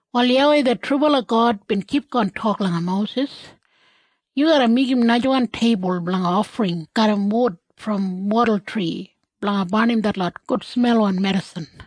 Wal YAWEI det trubala God bin kipgon tok langa Mosis, “Yu garra meigim najawan teibul blanga ofring garram wud brom wadultri blanga barnim detlot gudsmelwan medisin.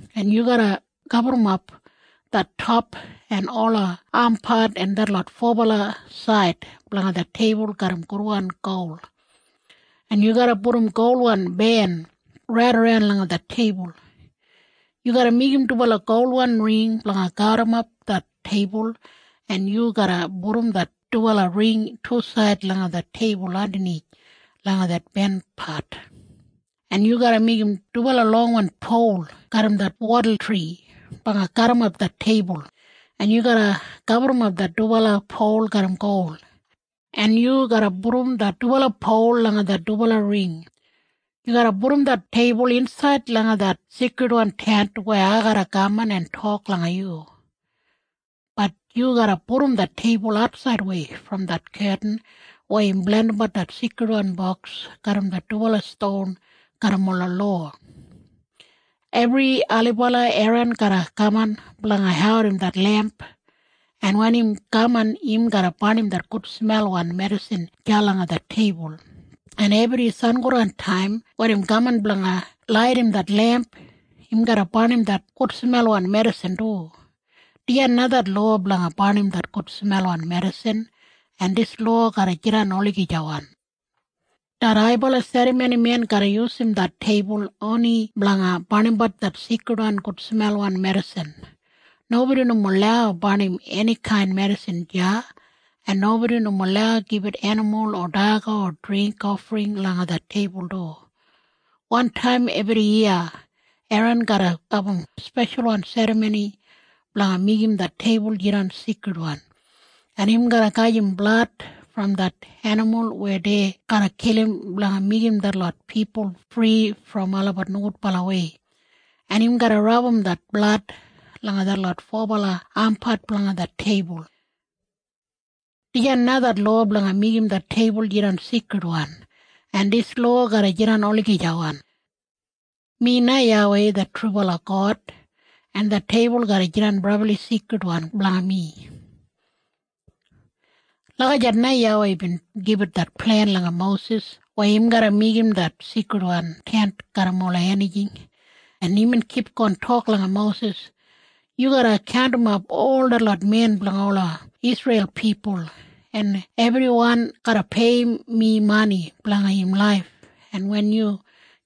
en yu garra gaburrumap det top en ola ampat en detlot fobala said blanga det teibul garram gudwan gol, en yu garra pudum golwan ben raidaran langa det teibul. Yu garra meigim dubala golwan ring blanga garrimap det teibul, en yu garra pudum det dubala ring tusaid langa det teibul andanith langa det benpat, en yu garra meigim dubala longwan pol garram det wadultri blanga garrimap det teibul, en yu garra gaburrumap det dubala pol garram gol, en yu garra pudum det dubala pol langa det dubala ring. Yu garra pudum det teibul insaid langa det Seikridwan Tent weya ai garra kaman en tok langa yu. Det teibul garra jidan atsaidwei brom det ketin weya im blandimbat det Seikridwan Boks garram det dubala ston garram ola lowa. Ebri ailibala Eran garra kaman blanga audim det lemp, en wen im kaman, im garra barnim det gudsmelwan medisin deya langa det teibul, en ebri sangodantaim wen im kaman blanga laidim det lemp, im garra barnim det gudsmelwan medisin du. Dijan na det lowa blanga barnim det gudsmelwan medisin, en dis lowa garra jidan olagijawan. Det haibala serramonimen garra yusum det teibul oni blanga barnimbat det seikrid gudsmelwan medisin. Nobodi nomo lau barnim enikain medisin deya, en nobodi nomo lau gibit enimul o daga o dringk ofring langa det teibul du. Wantaim ebriyiya Eran garra abum speshalwan serramoni blanga meigim det teibul jidan seikridwan, en im garra gajim blad brom det enimul weya dei garra kilim blanga meigim detlot pipul fri brom olabat nogudbalawei, en im garra rabum det blad langa detlot fobala ampat blanga det teibul. Dijan na det lowa blanga meigim det teibul jidan seikridwan, en dis lowa garra jidan olagijawan. Mi na YAWEI det trubala God, en det teibul garra jidan brabli seikridwan blanga mi.” Lagijat na YAWEI bin gibit det plen langa Mosis weya im garra meigim det Seikridwan Tent garram ola enijing, en imbin kipgon tok langa Mosis, “Yu garra kaundimap ol detlot men blanga ola Isreil pipul, en ebriwan garra peiyim mi mani blanga im laif, en wen yu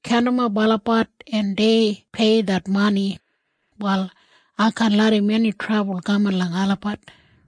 kaundimap olabat en dei pei det mani, wal ai kaan larram eni trabul kaman langa olabat.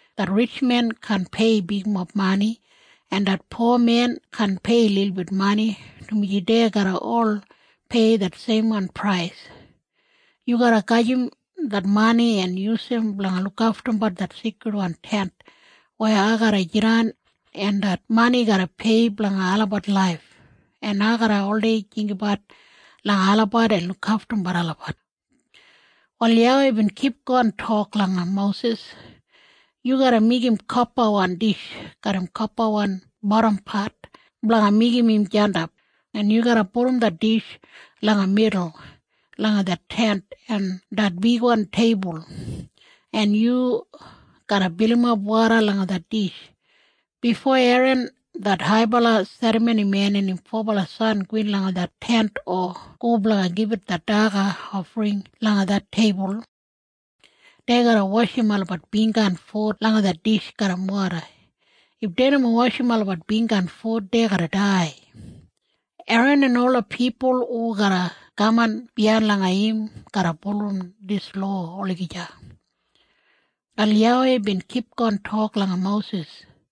Det ritjmen kaan pei bigmob mani, en det pomen kaan pei lilbit mani, dumaji dei garra ol pei det seimwan prais. Yu garra gajim det mani en yusum blanga lukaftumbat det Seikridwan Tent weya ai garra jidan, en det mani garra pei blanga olabat laif, en ai garra oldei jinggabat langa olabat en lukaftumbat olabat.” Wal YAWEI bin kipgon tok langa Mosis, “Yu garra meigim kopawan dish garram kopawan bodampat blanga meigim im jandap, en yu garra pudum det dish langa midul langa det Tent en det bigwan teibul, en yu garra bilimap woda langa det dish. Bifo Eran det haibala serramonimen en im fobala san gowin langa det Tent o go blanga gibit det daga ofring langa det teibul, dei garra washim olabat bingga en fut langa det dish garram woda. If dei nomo washim olabat bingga en fut, dei garra dai. Eran en ola pipul hu garra kaman biyain langa im garra bulurrum dis lowa olagija.” Wal YAWEI bin kipgon tok langa Mosis,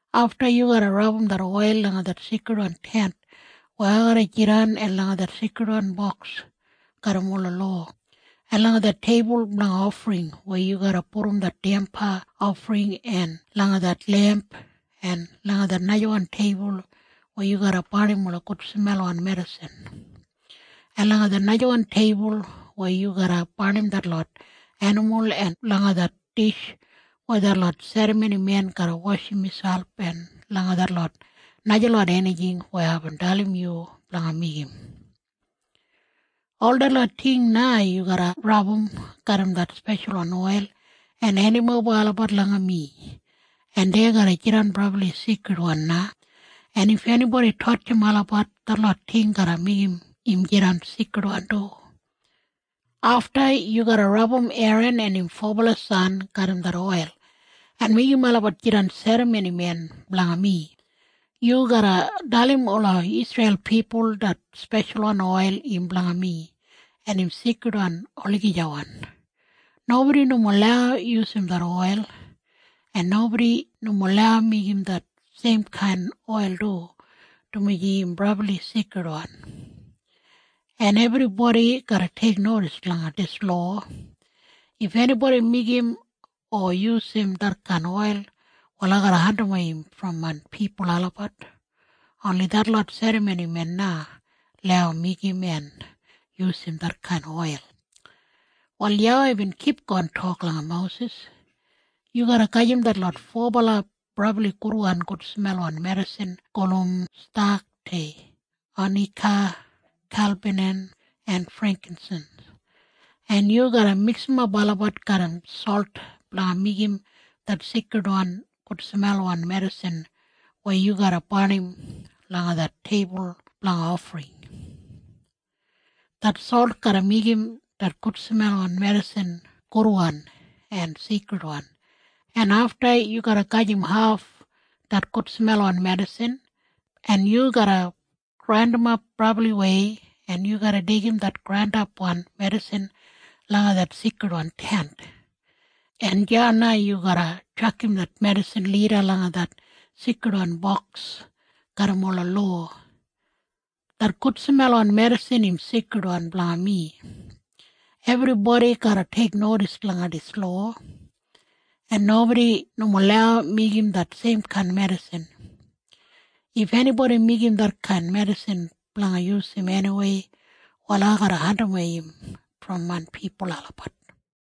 “Afta yu garra rabum det oil langa det Seikridwan Tent weya ai garra jidan en langa det Seikridwan Boks garram ola lowa en langa det teibul blanga ofring weya yu garra pudum det damba ofring en langa det lemp en langa det najawan teibul weya yu garra barnim ola gudsmelwan medisin, en langa det najawan teibul weya yu garra barnim detlot enimul en langa det dish weya detlot serramonimen garra washim miselp en langa detlot najalot enijing weya aibin dalim yu blanga meigim. Ol detlot ting na yu garra rabum garram det speshalwan oil en hendimoba olabat langa mi, en dei garra jidan brabli seikridwan na. En if enibodi tatjim olabat, detlot ting garra meigim im jidan seikridwan du. “Afta yu garra rabum Eran en im fobala san garram det oil en meigim olabat jidan serramonimen blanga mi. Yu garra dalim ola Isreil pipul det speshalwan oil im blanga mi, en im seikridwan olagija. Nobodi nomo lau yusum det oil, en nobodi nomo lau meigim det seimkain oil du, dumaji im brabli seikridwan. En ebribodi garra teiknodis langa dis lowa. If enibodi meigim o yusum detkain oil, wal ai garra andimwei im brom main pipul olabat. Oni detlot serramonimen na lau meigim en yusum detkain oil.” Wal YAWEI bin kipgon tok langa Mosis, “Yu garra gajim detlot fobala brabli gudwan gudsmelwan medisin gulum stakte, onika, galbanam en freinkinsins, en yu garra miksimap olabat garram solt blanga meigim det seikridwan gudsmelwan medisin weya yu garra barnim langa det teibul blanga ofring. Det solt garra meigim det gudsmelwan medisin gudwan en seikridwan, en afta yu garra gajim haf det gudsmelwan medisin, en yu garra grandimap brabliwei, en yu garra deigim det grandapwan medisin langa det Seikridwan Tent, en deya na yu garra tjakam det medisin lida langa det Seikridwan Boks garram ola lowa. Det gudsmelwan medisin im seikridwan blanga mi. Ebribodi garra teiknodis langa dis lowa, en nobodi nomo lau meigim det seimkain medisin. If enibodi meigim detkain medisin blanga yusum eniwei, wal ai garra andimwei im brom main pipul olabat.”